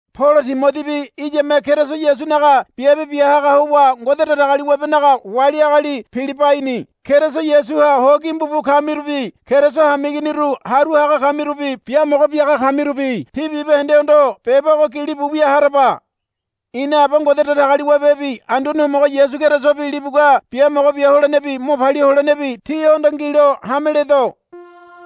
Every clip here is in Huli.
Polo Timodibi iyame Keriso Yasunaga biabe bia haga howa Ngode Datagaliwabenaga wali agali Pilibaini Keriso Yasuha ho gimbu bu kamirubi Keriso hameiginiru haru haga kamirubi biamogo biaga kamirubi tí bibahendehondo beba ogo gilibu wia haraba. Ina Aba Ngode Datagaliwabebi Anduane Homogo Yasu Kerisobi libugua biamogo bia holenebi mo palia holenebi tíhondo ngilo hame ledo.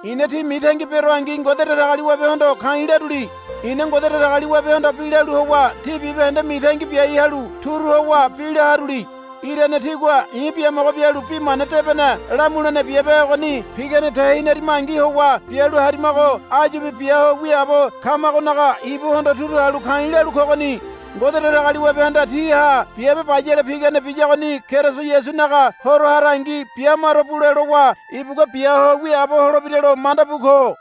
I̱na tí mitangi beroangi Ngode Datagaliwabehondo ka̱i̱ laruli. I̱na Ngode Datagaliwabehondo bi lalu howa tí bibahende mitangi biai halu turu howa bi la haruli. Irane tígua i̱ biamogo bialu bi mana debene lamulene biabe ogoni pigane tehinarimangi howa bialu harimago áyubi bia ho wiaabo kamagonaga ibuhondo turu halu ka̱i̱ lalu kogoni. Ngode Datagaliwabehanda tíha biabe bayale pigane biyagoni Keriso Yasunaga Horo harangi bia maro bule lowa ibugua bia ho wiaabo holebiralo manda bu ko.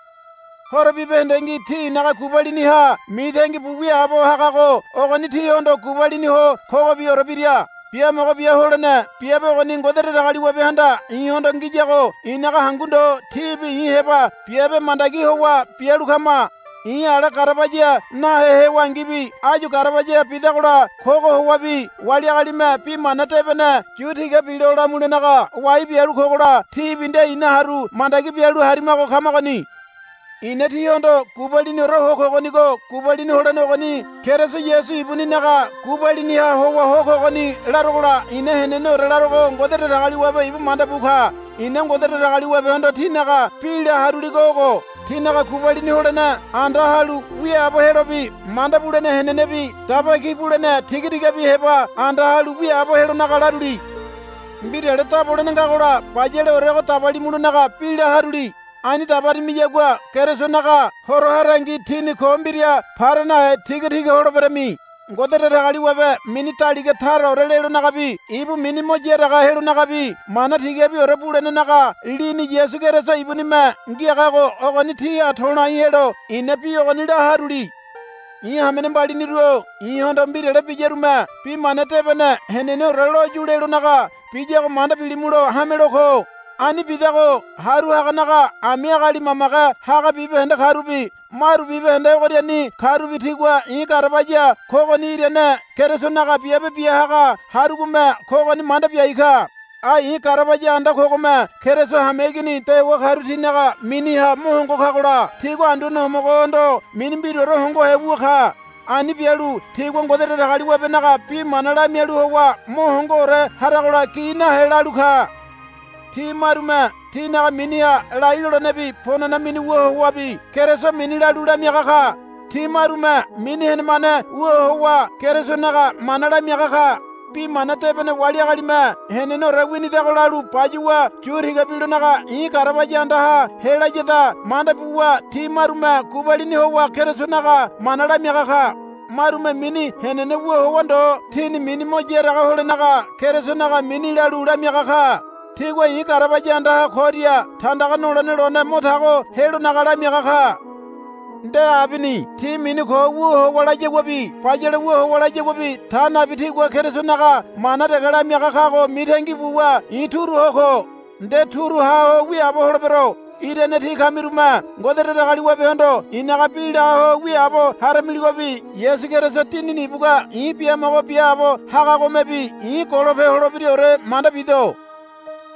Horo bibahendengi tí i̱naga gubaliniha mitangi bu wiaabo hagago ogoni tíhondo gubalini ho kogobiore bira. Biamogo bia holene biabe ogoni Ngode Datagaliwabehanda i̱hondo ngiyago i̱naga hangu ndo tíbi i̱ heba biabe mandagi howa bialu kama. I̱ ala garabaya nahe hewangibi áyu garabaya bidagola kogo howabi wali agalime Bi Mana Debene yu tiga bilo lamulenaga wai bialu kogola tíbi nde ina haru mandagi bialu harimago kamagoni. I̱na tíhondo gubaliniore ho kogonigo gubalini holene ogoni Keriso Yasu ibuninaga gubaliniha howa ho kogoni larogola i̱na heneneore larogo Ngode Datagaliwabe ibu manda bu ka. I̱na Ngode Datagaliwabehondo tínaga bi la haruligo ogo. Tínaga gubalini holene anda halu wiaabo helobi manda bulene henenebi daba ki bulene tiga tigabi heba anda halu wiaabo helonaga laruli. Mbirale dabolene ngagola bayaleorego dabalimulonaga bi la haruli. Ani dabarimiyagua Kerisonaga Horo harangi tíni ko mbira para nahe tigatiga holeberami. Ngode Datagaliwabe mini daliga taraore lelonagabi ibu mini mo yaraga helonagabi mana tigabiore bulenenaga lini Yasu Keriso ibunime ngiagago ogoni tíha to̱lai helo i̱na bi ogoni la haruli. I̱ hamene mbaliniru-o i̱hondo mbirale biyarume Bi Mana Debene heneneore lo yu lelonaga biyago manda bilimulo hamelo ko. Ani bidago haru haganaga ami agali mamage haga bibahende karubi maru bibahende ogoriani karubi tigua i̱ garabaya kogoni irane Kerisonaga biabe bia haga harugome kogoni manda biai ka. Ai i̱ garabaya anda kogome Keriso hameigini dewa karu tinaga miniha mo hongo kagola tigua Anduane Homogohondo mini mbiraore hongohe wu ka. Ani bialu tigua Ngode Datagaliwabenaga bi mana lamialu howa mo hongoore haragola gi nahe lalu ka. Ti marume tinaga miniha lai lolenebi ponana mini wu howabi Keriso mini lalu lamiaga ka. Ti marume mini henemane wu howa Kerisonaga mana lamiaga ka. Bi mana debene wali agalime heneneore winidago lalu bayuwa yu tiga bilonaga i̱ garabaya andaha helayada manda buwa ti marume gubalini howa Kerisonaga mana lamiaga ka. Marume mini henene wu howa ndo tini mini mo yaraga holenaga Kerisonaga mini lalu lamiaga ka. Tigua i̱ garabaya andaha koria tandaga nolene lone mo tago helonaga lamiaga ka. Nde abini. Ti mini ko wu howa layaguabi bayale wu howa layaguabi ta nabi tigua Kerisonaga mana dege lamiaga kago mitangi buwa i̱ turu ho ko. Nde turu ha ho wiaabo holebero. Irane tí kamirume Ngode Datagaliwabehondo i̱naga bi la ho wiaabo haramiligobi Yasu Keriso Dinini ibugua i̱ biamogo biaabo hagagomebi i̱ golope holebiraore manda bido.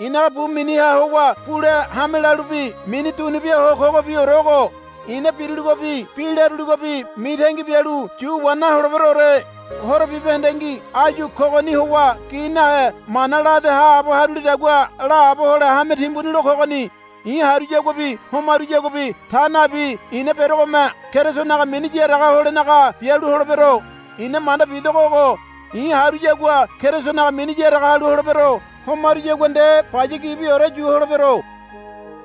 I̱naga bu miniha howa bule hame lalubi mini dunubia ho kogobiore ogo. I̱na biruligobi bi laruligobi mitangi bialu yu wa naholeberoore. Horo bibahendengi áyu kogoni howa gi nahe mana lade haabo harulidagua laabo hole hame timbuni lo kogoni. I̱ haruyaguabi homaruyaguabi ta nabi i̱na berogome Kerisonaga mini yaraga holenaga bialu holebero. I̱na manda bidogo ogo. I̱ haruyagua Kerisonaga mini yaraga halu holebero. Homaruyagua nde baya gibiore yu holebero.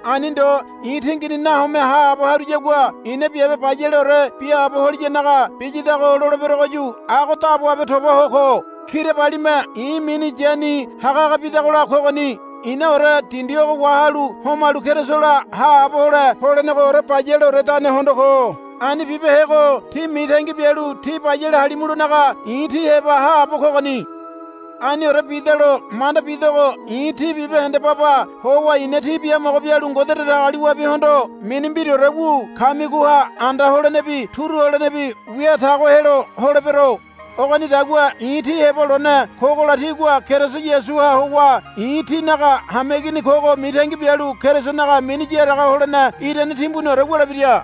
Ani ndo i̱ tingini nahome haabo haruyagua i̱na biabe bayaleore biaabo holiyanaga biyadago loleberogoyu ago daboabe tobaho ko. Kirabalime i̱ mini yani haga haga bidagola kogoni. I̱naore dindi ogo wahalu homalu Kerisola haabo hole polenegoore bayaleoredane hondo ko. Ani bibehego tí mitangi bialu tí bayale halimulonaga i̱ tí heba haabo kogoni. Aniore bidalo manda bidogo i̱ tí bibahende baba howa i̱na tí biamogo bialu Ngode Datagaliwabehondo mini mbiraore wu kamigoha anda holenebi turu holenebi wia tago helo holebero. Ogonidagua i̱ tí heba lone kogola tígua Keriso Yasuha howa i̱ tínaga hameigini kogo mitangi bialu Kerisonaga mini yaraga holene irane timbuniore wulebira.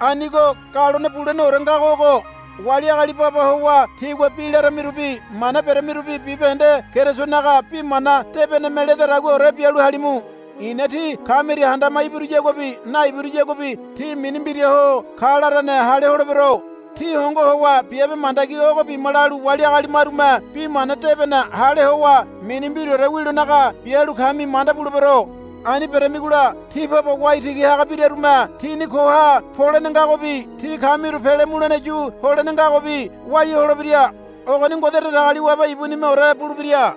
Anigo galone buleneore ngago ogo. Wali agali baba howa tígua bi laramirubi mana beremirubi bibahende Kerisonaga bi mana debeneme ledadaguaore bialu halimu. I̱na tí kamiria handama ibiruyaguabi naibiruyaguabi tí mini mbiraho ka larane hale holebero. Tí hongo howa biabe mandagi ogo bima lalu wali agali marume bi mana debene hale howa mini mbiraore wilonaga bialu kami manda bulebero. Ani beramigola tí baba waitigi haga birarume tini koha polene ngagobi tí kamiru pele mulene yu holene ngagobi walia holebira. Ogoni Ngode Datagaliwabe ibunimeore bulebira.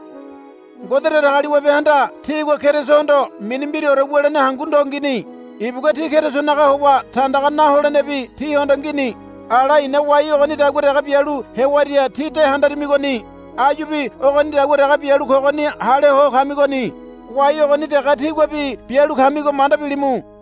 Ngode Datagaliwabehanda tígua Kerisohondo mini mbiraore wulene hangu ndo ngini. Ibugua tí Kerisonaga howa tandaga na holenebi tíhondo ngini. Ala i̱na wai ogonidagua dege bialu hewaria tí de handarimigoni. Áyubi ogonidagua dege bialu kogoni hale ho kamigoni. Wai ogoni dege tíguabi bialu kamigo manda bilimu.